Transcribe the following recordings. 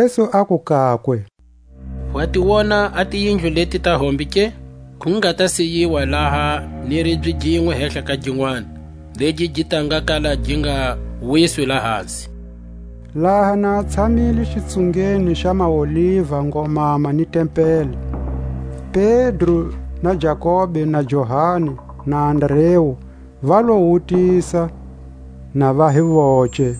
Jesu aku kakwe: Wa ti wona a tiyindlu leti ta hombe ke? Ku nga ta siyiwa laha ni ribye ginwe hehla ka ginwani, legi gi ta nga kala gi nga wiswi lahasi. Laha na a tshamile xitsungeni xa maOliva ngomama ni tempeli, Pedro na Jakobe na Johani na Andreu va lo mu wutisa na va hi voce,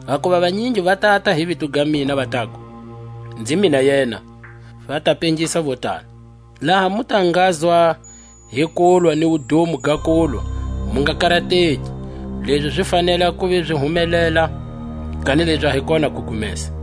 Hakuva vanyingi va tata hi vito ga mina, va taku: Nzi mina yena; va ta pengisa vo tala. Laha mu ta ngazwa hi kulwa ni wudumo ga kulwa, mu nga karateki; lezi zi fanele a kuva zi humelela, kanilezi a hi kona kugumesa.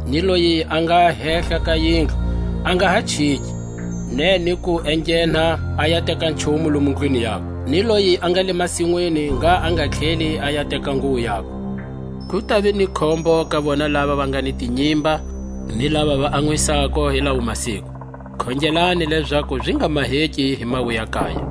ni loyi a nga hehla ka yindlu a nga ha chiki, ne ni ku enghena a ya teka nchumu lomu ndlwini yakwe. Ni loyi a nga le masinwini ngha a nga tlheli a ya teka nguwo yakwe. Ku tava ni khombo ka vona lava va nga ni tinyimba, ni lava va anwisako hi lawo masiku. Khongelani lezaku zi nga maheki hi mawuyakaya;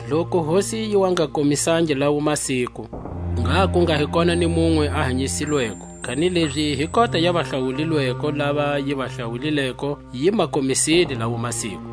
Loku Hosi yi wa nga komisangi lawo masiku, ngha ku nga hi kona ni munwe a hanyisilweko, kanilezi hi kota ya vahlawulilweko, lava yi va hlawulileko, yi ma komisile lawo masiku.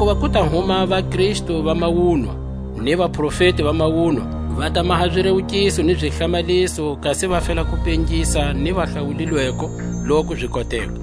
Hakuva ku ta huma vaKristu va mawunwa, ni vaprofeti va mawunwa; va ta maha zirewukiso ni zihlamaliso, kasi va fela ku pengisa ni vahlawulilweko loku zi koteka.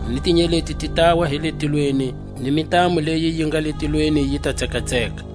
ni tinyeleti ti tawa hi le tilweni, ni mintamu leyi yi nga le tilweni yi ta tsekatseka.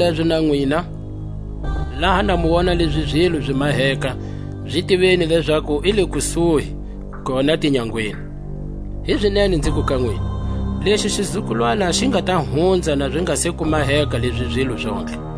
Hizalezo na nwina, laha na mu wona lezi zilo zi maheka, zi tiveni lezaku i le kusuhi, kona tinyangweni. Hizinene nziku ka nwina: Lexi xizukulwana xi nga ta hunza, na zi nga se ku maheka lezi zilo zontlhe.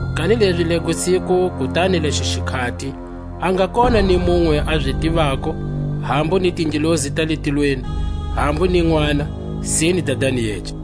Kanilezi lego siku kutani lexo xikhati, a nga kona ni munwe a zi tivako, hambu ni tingelosi ta le tilweni, hambu ni Nʼwana, sine Dadani yece.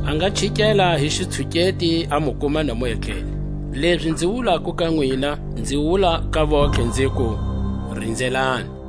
a nga chikela hi xitshuketi, a mu kuma na mu etlele. Lezi nzi wulako ka nwina, nzi wula ka vontlhe, nziku: Rinzelani!